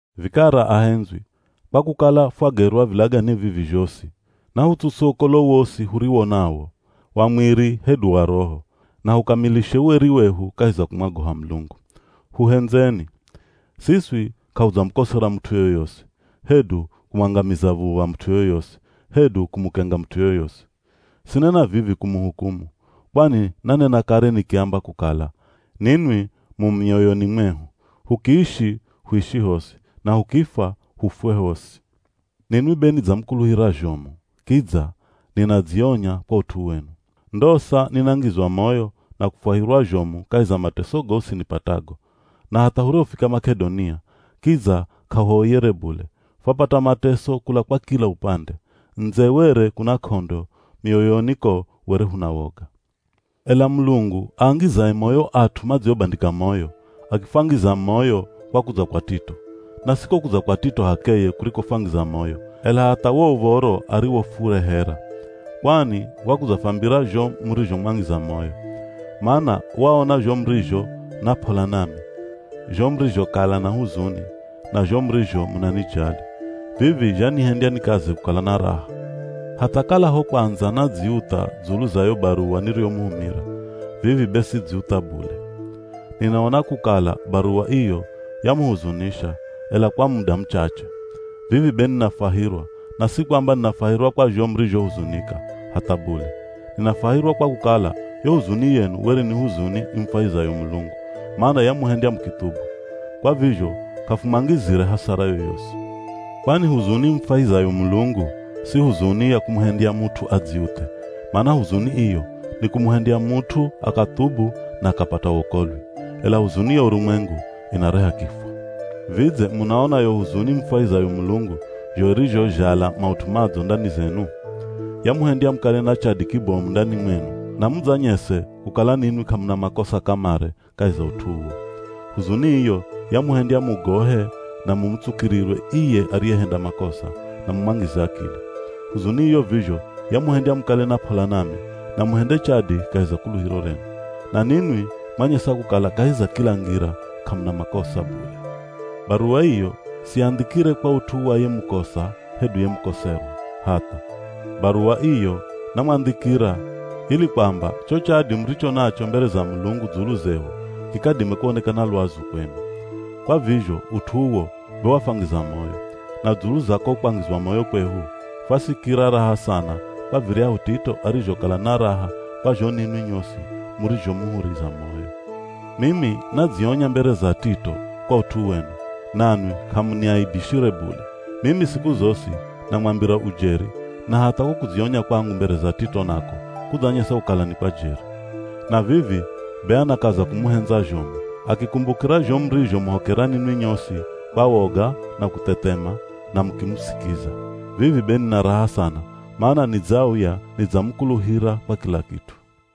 Vikara ahendzwi, kwa kukala fwagerwa vilagane vivi zhosi, nahutsuse ukolo wosi huriwo nawo, wa mwiri hedu wa roho, na hukamilishe ueri wehu kahi za kumwagoha Mulungu. Huhendzeni. Siswi k'ahudzamukosera mut'u yoyosi, hedu kumwangamiza v̱uv̱a mut'u yoyosi, hedu kumukenga mut'u yoyosi. Sinena vivi kumuhukumu, kwani nanena kare nikiamba kukala, ninwi mu mioyoni mwehu, hukiishi huishi hosi, na hukifwa hufwe hosi. Ninwi be nidzamukuluhira zhomu, kidza ninadzionya kwa ut'u wenu. Ndosa ninangizwa moyo, na kufwahirwa zhomu kahi za mateso gosi nipatago. Na hatha hurihofika Mak'edonia, kidza k'ahuoyere bule, fwapata mateso kula kwa kila upande. Ndze were kuna k'ondo, mioyoni ko were huna woga. Ela Mulungu aangizaye moyo at'u madziobandika moyo, akifwangiza moyo kwa kudza kwa Tito. Na si ko kudza kwa Tito h'akeye kurikofwangiza moyo, ela hatha wo uv̱oro ariwofurehera. Kwani wakudzafwambira zho murizhomwangiza moyo. Mana waona zho murizho na p'ola nami, zho murizhokala na huzuni, na zho murizho munanijali. Vivi zhanihendya nikaze kukala na raha. Hatha kala ho kwandza nadziutha dzulu za yo baruwa niriyomuhumira, vivi be sidzutha bule. Ninaona kukala baruwa iyo yamuhuzunisha, ela kwa muda muchache. Vivi be ninafwahirwa, na si kwamba ninafwahirwa kwa zho murizhohuzunika, hatha bule. Ninafwahirwa kwa kukala yo huzuni yenu were ni huzuni imufwahizayo Mulungu, mana yamuhendya mukithubu. Kwa vizho k'afumwangizire hasara yoyosi. Kwani huzuni imufwahizayo Mulungu si huzuni ya kumuhendya mut'u adziuthe, mana huzuni iyo nikumuhendya mut'u akathubu na akapata wokolwi. Ela huzuni ya urumwengu inareha kifwa. Vidze munaona yo huzuni imufwahizayo Mulungu zho irizhozhala maut'u madzo ndani zenu? Yamuhendya mukale na chadi kibomu ndani mwenu, na mudzanyese kukala ninwi k'amuna makosa kamare kahi za ut'u uwo. Huzuni iyo yamuhendya mugohe na mumutsukirirwe iye ariyehenda makosa, na mumwangize akili. Huzuni iyo vizho yamuhendya mukale na p'ola nami, na muhende chadi kahi za kuluhiro renu. Na ninwi mwanyesa kukala kahi za kila ngira k'amuna makosa bule. Baruwa iyo siyandhikire kwa ut'u wa ye mukosa hedu ye mukoserwa, hatha! Baruwa iyo namwandhikira ili kwamba cho chadi muricho nacho mbere za Mulungu dzulu zehu, kikadime kuonekana lwazu kwenu. Kwa vizho ut'u uwo be wafwangiza moyo. Na dzulu za ko kwangizwa moyo kwehu, fwasikira raha sana kwa viryahu Tito arizhokala na raha kwa zho ninwi nyosi murizhomuhuriza moyo. Mimi nadzionya mbere za Tito kwa ut'u wenu, nanwi k'amuniaibishire bule. Mimi siku zosi namwambira ujeri, na hatha ko kudzionya kwangu mbere za Tito nako kudzanyesa kukala ni kwa jeri. Na vivi be anakaza kumuhendza zhomu, akikumbukira zho murizhomuhokera ninwi nyosi kwa woga na kuthethema, na mukimusikiza. Vivi be nina raha sana mana nidzauya nidzamukuluhira kwa kila kit'u.